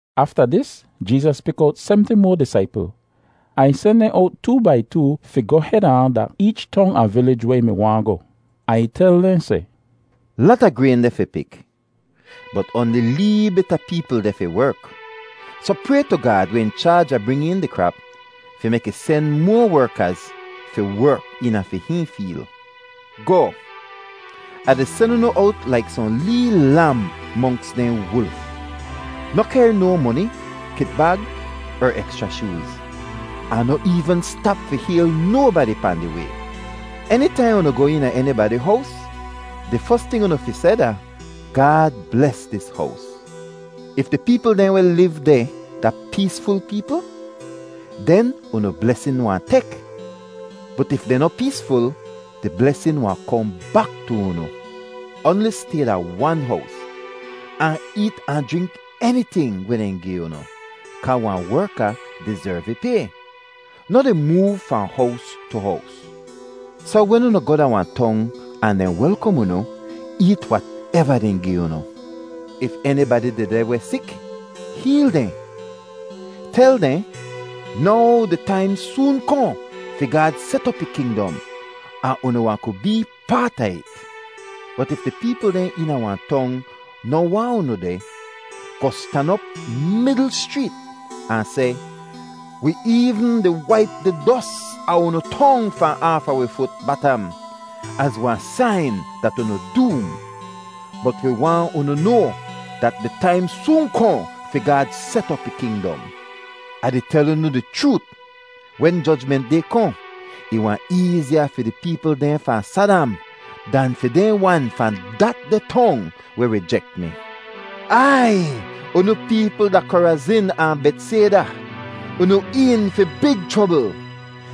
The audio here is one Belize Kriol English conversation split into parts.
Afta dis Jeezas pik owt semti moa disaipl. Ahn ih sen dehn owt too-bai-too fi goh heda ahn da eech tong ahn vilij weh ih mi waahn goh. Ahn ih tel dehn seh, “Lata grayn deh fi pik, bot oanli lee bit a peepl deh fi werk. Soh pray tu Gaad weh in chaaj a bring een di krap fi mek ih sen moa werkaz fi werk eena fi hihn feel. Goh! Ah di sen unu owt laik sohn lee lam monks dehn wulf. Noh kehr no moni, kitbag er ekschra shooz, ahn noh eevn stap fi hayl nobadi pahn di way. “Enitaihn unu goh eena enibadi hows, di fos ting unu fi seh da, ‘Gaad bles dis hows.’ If di peepl dehn weh liv deh da peesful peepl, den unu blesin wahn tek, bot if dehn noh peesful, di blesin wahn kohn bak tu unu. Oanli stay da wan hows, ahn eet ahn jrink eniting weh dehn gi unu kaa wahn werka dizerv ih pay. Noh di moov fahn hows tu hows. Soh wen unu goh da wahn tong ahn dehn welkom unu, eet wateva dehn gi unu. If enibadi dehdeh weh sik, heel dehn. Tel dehn, ‘Now di taim soon kohn fi Gaad set op ih kingdom ahn unu wahn ku bee paat a it.’ Bot if di peepl dehn eena wahn tong noh waahn unu deh, goh stan op midl schreet ahn seh, ‘Wi eevn di waip di dos a unu tong fahn aafa wi fut batam az wahn sain dat unu doom. Bot wi waahn unu noa dat di taim soon kohn fi Gaad set op ih kingdom.’ Ah di tel unu di chroot, wen Jojment Day kohn, ih wahn eeziya fi di peepl dehn fahn Sadam dan fi dehn wan fahn datdeh tong weh rijek mi. “Aiy, unu peepl da Korazin ahn Betsayda, unu een fi big chrobl.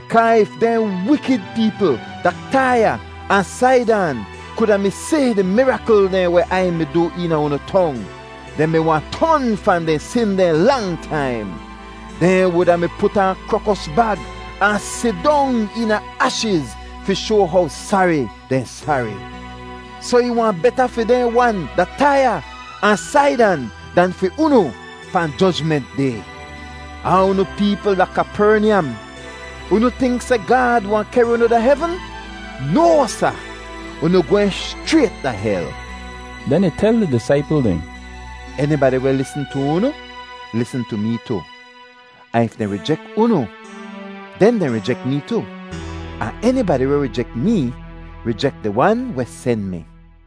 Kaa if dehn wikid peepl da Taiya ahn Saidan kuda mi si di mirakl dehn weh Ai mi du eena unu tong, dehn mi wahn ton fahn dehn sin dehn lang taim. Dehn wuda mi put aan krokos bag ahn sidong eena ashiz fi shoa how sari dehn sari. Soh ih wahn beta fi dehn wan da Taiya ahn Saidan dan fi unu pahn Jojment Day. Ahn unu peepl da Kapernyam, unu tink seh Gaad wahn kehr unu da hevn? No, sa! Unu gwehn schrayt da hel!” Den ih tel di disaipl dehn, “Enibadi weh lisn tu unu lisn tu mee tu. Ahn if dehn rijek unu, den dehn rijek mee tu, ahn enibadi weh rijek mee rijek di Wan weh sen mi.”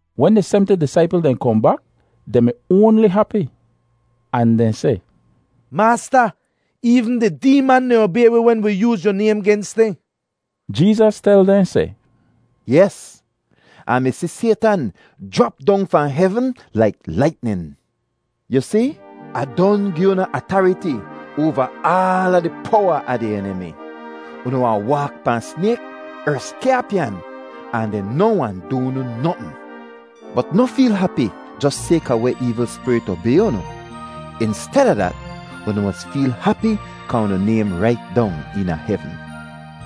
Wen di semti disaipl dehn kohn bak, dehn mi oanli hapi, ahn dehn seh, “Maasta, eevn di deeman dehn obay wi wen wi yooz yu naym gens dehn!” Jeezas tel dehn seh, “Yes! Ah mi si Saytan jrap dong fahn hevn laik laitnin. Yu si, Ah don gi unu atariti oava aala di powa a di enimi. Unu wahn waak pahn snayk er skyaapyan, ahn dehn noh wahn du unu notn. Bot noh feel hapi jos sayka weh eevl spirit obay unu. Insteda dat, unu mos feel hapi kaa unu naym rait dong eena hevn!”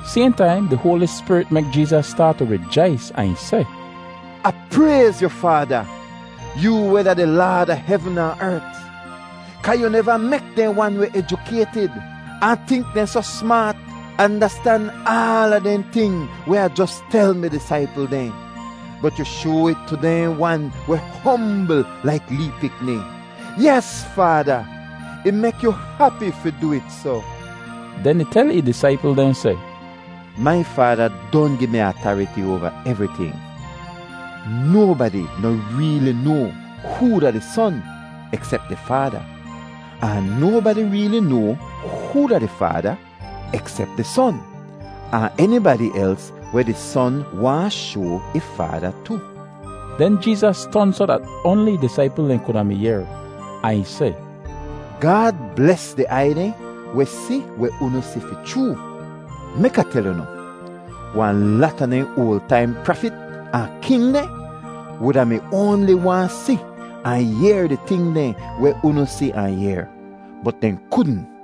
Sayhn taim di Hoali Spirit mek Jeezas staat tu rijais ahn ih seh, “Ah prayz yu, Faada, yoo weh da di Laad a hevn ahn ert, kaa yu neva mek dehn wan weh ejukaytid ahn tink dehn soh smaat andastan aala dehn ting weh Ah jos tel mi disaipl dehn, bot yu shoa it tu dehn wan weh hombl laik lee pikni. Yes, Faada, ih mek yu hapi fi du it soh.” Den ih tel ih disaipl dehn seh, “Mai Faada don gi mi atariti oava evriting. Nobadi noh reeli noa hoo da di Son eksep di Faada, ahn nobadi reeli noa hoo da di Faada eksep di Son, ahn enibadi els weh di Son waahn shoa ih Faada tu.” Den Jeezas ton soh dat oanli ih disaipl dehn kuda mi yehr, ahn ih seh, “Gaad bles di aiy dehn weh si weh unu si fi chroo. Mek Ah tel unu, wahn lata dehn oal taim prafit ahn king dehn wuda mi oanli waahn si ahn yehr di ting dehn weh unu si ahn yehr, bot dehn kudn.”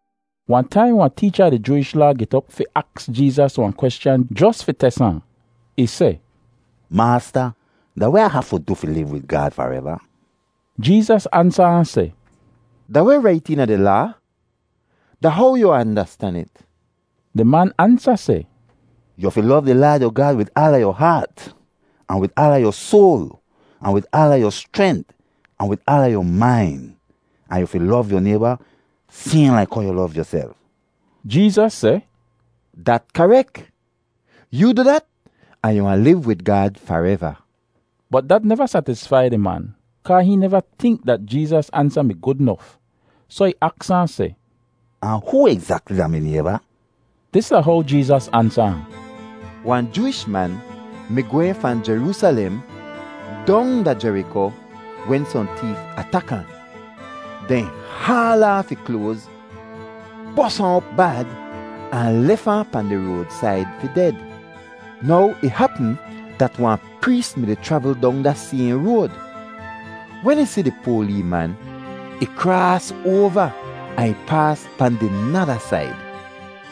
Wahn taim wahn teecha a di Jooish Laa get op fi aks Jeezas wahn kweschan jos fi tes ahn. Ih seh, “Maasta, da weh Ah hafu du fi liv wid Gaad fareva?” Jeezas ansa ahn seh, “Da weh rait eena di Laa? Da how yu andastan it?” Di man ansa seh, “‘Yu fi lov di Laad yu Gaad wid aala yu haat, ahn wid aala yu soal, ahn wid aala yu schrent, ahn wid aala yu main,’ ahn ‘yu fi lov yu nayba sayhn laik how yu lov yuself.’” Jeezas seh, “Dat karek. Yoo du dat ahn yu wahn liv wid Gaad fareva.” Bot dat neva satisfai di man, kaa hihn neva tink dat Jeezas ansa mi gud nof, soh ih aks ahn seh, “Ahn hoo egzakli da mi nayba?” Dis da how Jeezas ansa ahn: “Wahn Jooish man mi gwehn fahn Jeroosalem dong da Jeriko wen sohn teef atak ahn. Dehn haal aaf ih kloaz, bos ahn op bad, ahn lef ahn pahn di roadsaid fi ded. Now ih hapm dat wahn prees mi-di chravl dong da sayhn road. Wen ih si di poa lee man, ih kraas oava ahn ih paas pahn di nada said.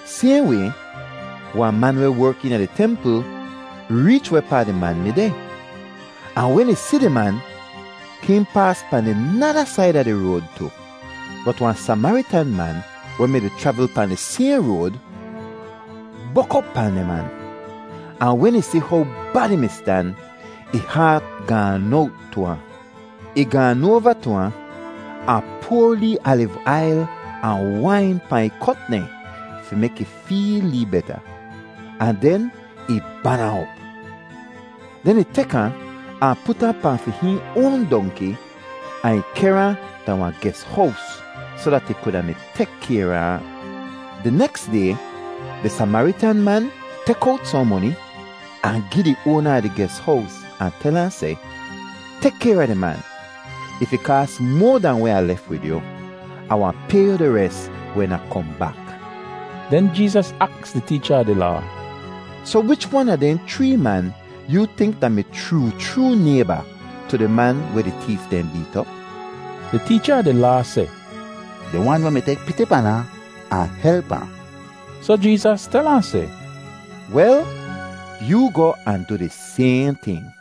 Sayhn way, wahn man weh werk eena di templ reech wehpaa di man mi deh, ahn wen ih si di man, hihn paas pahn di nada said a di road tu. Bot wahn Samaritan man weh mi-di chravl pahn di sayhn road, bok op pahn di man. Ahn wen ih si how bad ih mi stan, ih haat gaan owt tu ahn. Ih gaan oava tu ahn, ahn poar lee aliv ail ahn wain pahn ih kot dehn fi mek ih feel lee beta, ahn den ih ban ahn op. Den ih tek ahn, ahn put ahn pahn fi hihn oan dongki ahn ih kehr ahn da wahn ges-hows soh dat ih kuda mi tek kayr a ahn. Di neks day di Samaritan man tek owt sohn moni ahn gi di oana a di ges-hows ahn tel ahn seh, ‘Tek kayr a di man. If ih kaas moa dahn weh Ah lef wid yu, Ah wahn pay yu di res wen Ah kohn bak.’” Den Jeezas aks di teecha a di Laa, “Soh wich wan a dehn chree man yoo tink da-mi chroo chroo nayba tu di man weh di teef dehn beet op?” Di teecha a di Laa seh, “Di wan weh mi tek piti pan ahn, ahn help ahn.” Soh Jeezas tel ahn seh, “Wel, yoo goh ahn du di sayhn ting.”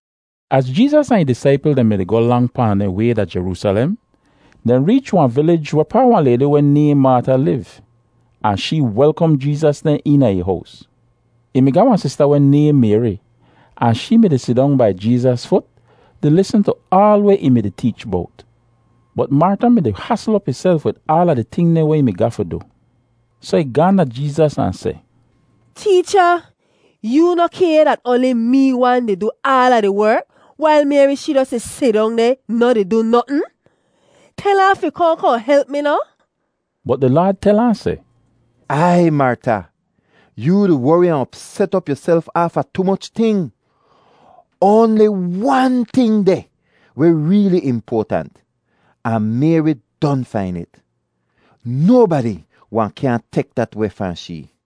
Az Jeezas ahn ih disaipl dehn mi-di goh lang pahn dehn way da Jeroosalem, dehn reech wahn vilij wehpaa wahn laydi weh nayhn Marta liv, ahn shee welkom Jeezas dehn eena ih hows. Ih mi ga wahn sista weh nayhn Mayri, ahn shee mi-di sidong bai Jeezas fut di lisn tu aal weh ih mi-di teech bowt. Bot Marta mi-di hasl op ihself wid aala di ting dehn weh ih mi ga fi du. Soh ih gaahn da Jeezas ahn seh, “Teecha, yoo noh kay dat oanli mee wan di du aala di werk wail Mayri shee jos di sidong deh, noh di du notn? Tel ahn fi kohn kohn help mi noh?” Bot di Laad tel ahn seh, “Aiy, Marta! Yoo di wori ahn opset op yuself aafa tu moch ting. Oanli wan ting deh weh reeli impoatant, ahn Mayri don fain it. Nobadi wahn kyaahn tek dat weh fahn shee.”